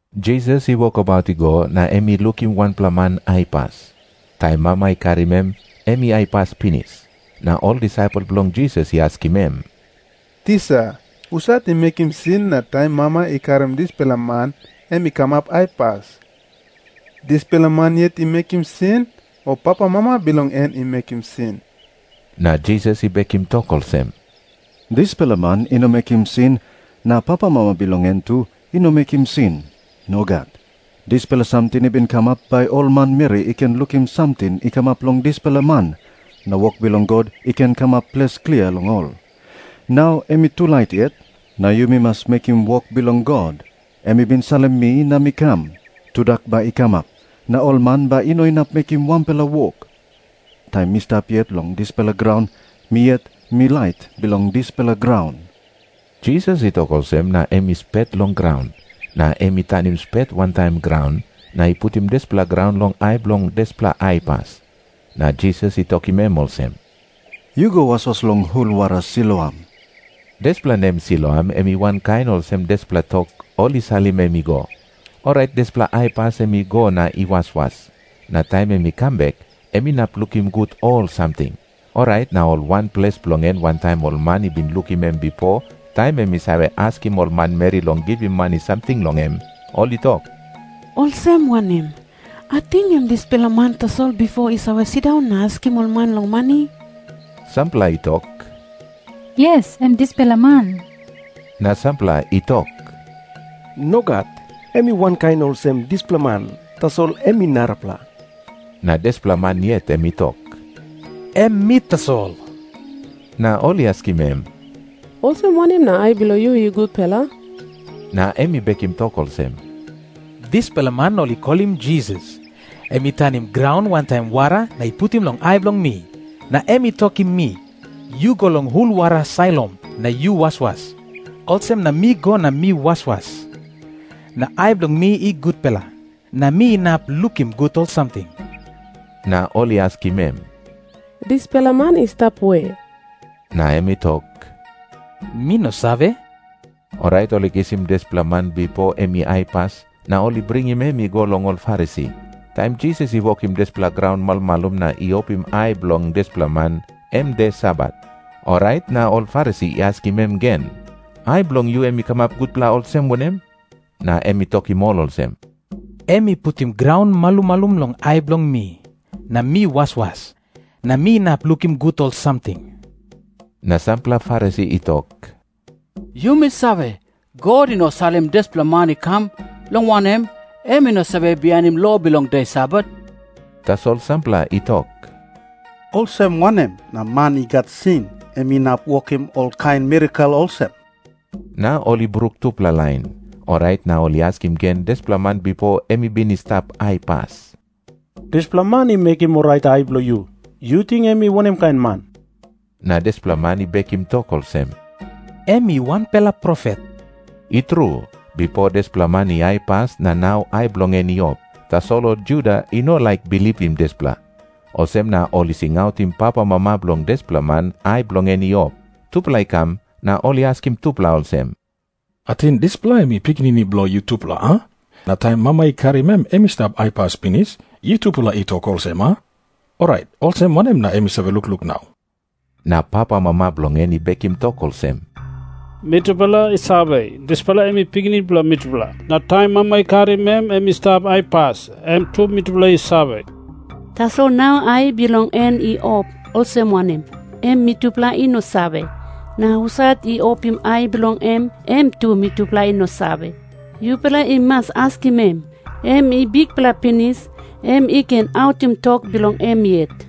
Jisas i wokabaut i go, na em i lukim wanpela man aipas. Taim mama i karim em, em i aipas pinis. Na ol disaipel bilong Jisas i askim em, “Tisa, husat i mekim sin na taim mama i karim dispela man em i kamap aipas? Dispela man yet i mekim sin, o papamama bilong en i mekim sin?” Na Jisas i bekim tok olsem, “Dispela man i no mekim sin, na papamama bilong en tu i no mekim sin. Nogat. Dispela samting i bin kamap bai ol manmeri i ken lukim samting i kamap long dispela man, na wok bilong God i ken kamap ples klia long ol. Nau em i tulait yet, na yumi mas mekim wok bilong God, em i bin salim mi na mi kam. Tudak bai i kamap, na ol man bai i no inap mekim wanpela wok. Taim mi stap yet long dispela graun, mi yet mi lait bilong dispela graun.” Jisas i tok olsem na em i spet long graun. Na em i tanim spet wantaim graun, na i putim dispela graun long ai bilong dispela aipas. Na Jisas i tokim em olsem, “Yu go waswas long hul wara Siloam.” Dispela nem Siloam em i wankain olsem dispela tok, “Ol i salim em i go.” Orait dispela aipas em i go na i waswas. Na taim em i kam bek, em inap lukim gut ol samting. Orait na ol wanples bilong en wantaim ol man i bin lukim em bipo, taim em i save askim ol manmeri long givim mani samting long em, ol i tok, “Olsem wanem? Ating em dispela man tasol bipo i save sindaun na askim ol man long mani?” Sampela i tok, “Yes, em dispela man.” Na sampela i tok, “Nogat. Em i wankain olsem dispela man, tasol em i narapela.” Na dispela man yet em i tok, “Em mi tasol.” Na ol i askim em, “Olsem wanem na ai bilong yu i gutpela?” Na em i bekim tok olsem, “Dispela man ol i kolim Jisas, em i tanim graun wantaim wara na i putim long ai bilong mi. Na em i tokim mi, ‘Yu go long hul wara Siloam na yu waswas.’ Olsem na mi go na mi waswas, na ai bilong mi i gutpela, na mi inap lukim gut ol samting.” Na ol i askim em, “Dispela man i stap we?” Na em i tok, “Mi no save.” Orait ol i kisim dispela man bipo em i aipas, na ol i bringim em i go long ol Farisi. Taim Jisas i wokim dispela graun malumalum na i opim ai bilong dispela man, em de Sabat. Orait na ol Farisi i askim em gen, “Ai bilong yu em i kamap gutpela olsem wanem?” Na em i tokim ol olsem, “Em i putim graun malumalum long ai bilong mi, na mi waswas, na mi inap lukim gut ol samting.” Na sampela Farisi i tok, “Yumi save, God i no salim dispela man i kam, long wanem, em i no save bihainim lo bilong de Sabat.” Tasol sampela i tok, “Olsem wanem na man i gat sin em inap wokim olkain mirakel olsem?” Na ol i bruk tupela lain. Orait na ol i askim gen dispela man bipo em i bin i stap aipas, “Dispela man i mekim orait ai bilong yu, yu ting em i wanem kain man?” Na dispela man i bekim tok olsem, “Em i wanpela profet.” I tru, bipo dispela man i aipas na nau ai bilong en i op. Tasol ol Juda i no laik bilipim dispela. Olsem na ol i singautim papamama bilong dispela man ai bilong en i op. Tupela i kam na ol i askim tupela olsem, “Ating dispela em i pikinini bilong yutupela, a? Na taim mama i karim em, em i stap aipas pinis, yutupela i tok olsem, a? Orait olsem wanem na em i save lukluk nau?” Na papamama bilong en i bekim tok olsem, “Mitupela i save, dispela em i pikinini bilong mitupela. Na taim mama i karim em, em i stap aipas, em tu mitupela i save. Tasol nau ai bilong en i op olsem wanem, em mitupela i no save. Na husat i opim ai bilong em, em tu mitupela i no save. Yupela i mas askim em. Em i bikpela pinis. Em i ken autim tok bilong em yet.”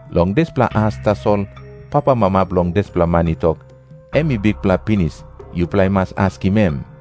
Long dispela as tasol papamama bilong dispela man i tok, “Em i bikpela pinis. Yupela i mas askim em.”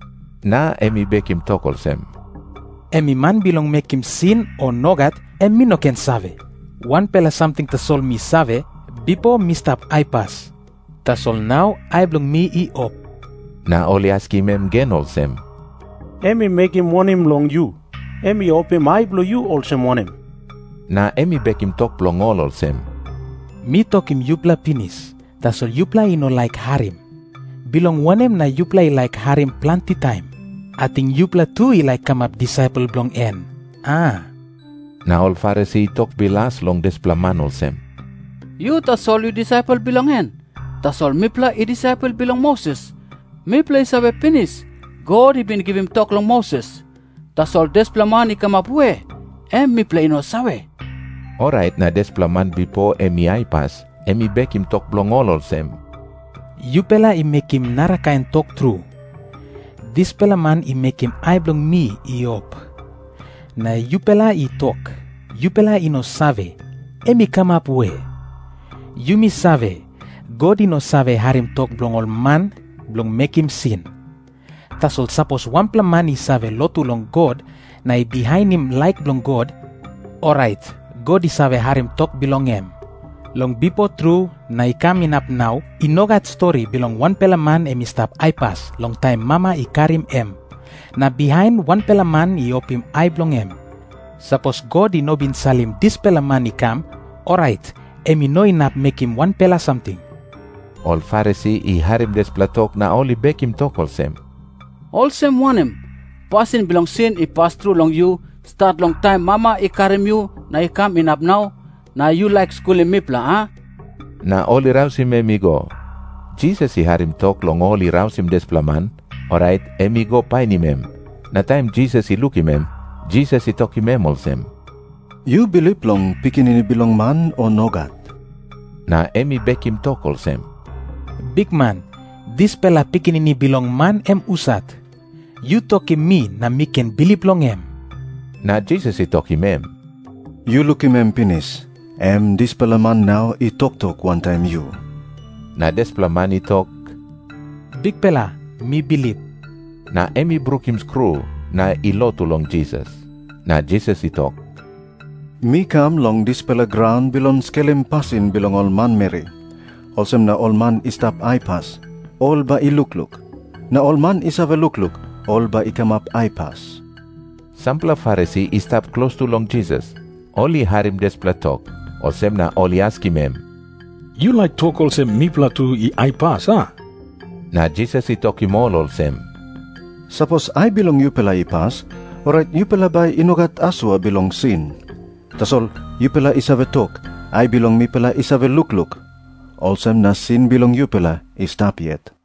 Na em i bekim tok olsem, “Em i man bilong mekim sin, o nogat, em mi no ken save. Wanpela samting tasol mi save. Bipo mi stap aipas, tasol nau ai bilong mi i op.” Na ol i askim em gen olsem, “Em i mekim wanem long yu? Em i opim ai bilong yu olsem wanem?” Na em i bekim tok bilong ol olsem, “Mi tokim yupela pinis, tasol yupela i no laik harim. Bilong wanem na yupela i laik harim planti taim? Ating yupela tu i laik kamap disaipel bilong en, a?” Na ol Farisi i tok bilas long dispela man olsem, “Yu tasol yu disaipel bilong en. Tasol mipela i disaipel bilong Moses. Mipela i save pinis, God i bin givim tok long Moses. Tasol dispela man i kamap we, em mipela i no save.” Orait na dispela man bipo em i aipas, em i bekim tok bilong ol olsem, “Yupela i mekim narakain tok tru. Dispela man i mekim ai bilong mi i op, na yupela i tok, yupela i no save, em i kamap we. Yumi save, God i no save harim tok bilong ol man bilong mekim sin. Tasol sapos wanpela man i save lotu long God na i bihainim laik bilong God, orait God i save harim tok bilong em. Long bipo tru na i kam inap nau i no gat stori bilong wanpela man em i stap aipas long taim mama i karim em, na bihain wanpela man i opim ai bilong em. Sapos God i no bin salim dispela man i kam, orait em i no inap mekim wanpela samting.” Ol Farisi i harim dispela tok na ol i bekim tok olsem, “Olsem wanem? Pasin bilong sin i pas tru long yu, stat long taim mama i karim yu na i kam inap nau. Na yu laik skulim mipela, a?” Na ol i rausim em i go. Jisas i harim tok long ol i rausim dispela man, orait em i go painim em. Na taim Jisas i lukim em, Jisas i tokim em olsem, “Yu bilip long Pikinini Bilong Man, o nogat?” Na em i bekim tok olsem, “Bikman, dispela Pikinini Bilong Man em husat? Yu tokim mi na mi ken bilip long em.” Na Jisas i tokim em, “Yu lukim em pinis. Em dispela man nau i toktok wantaim yu.” Na dispela man i tok, “Bikpela, mi bilip.” Na em i brukim skru na i lotu long Jisas. Na Jisas i tok, “Mi kam long dispela graun bilong skelim pasin bilong ol manmeri. Olsem na ol man i stap aipas, ol bai i lukluk. Na ol man i save lukluk, ol bai i kamap aipas.” Sampela Farisi i stap klostu long Jisas, ol i harim dispela tok. Olsem na ol i askim em, “Yu laik tok olsem mipela tu i aipas, a?” Na Jisas i tokim ol olsem, “Sapos ai bilong yupela i pas, orait yupela bai i no gat asua bilong sin. Tasol yupela i save tok, ‘Ai bilong mipela i save lukluk.’ Olsem na sin bilong yupela i stap yet.”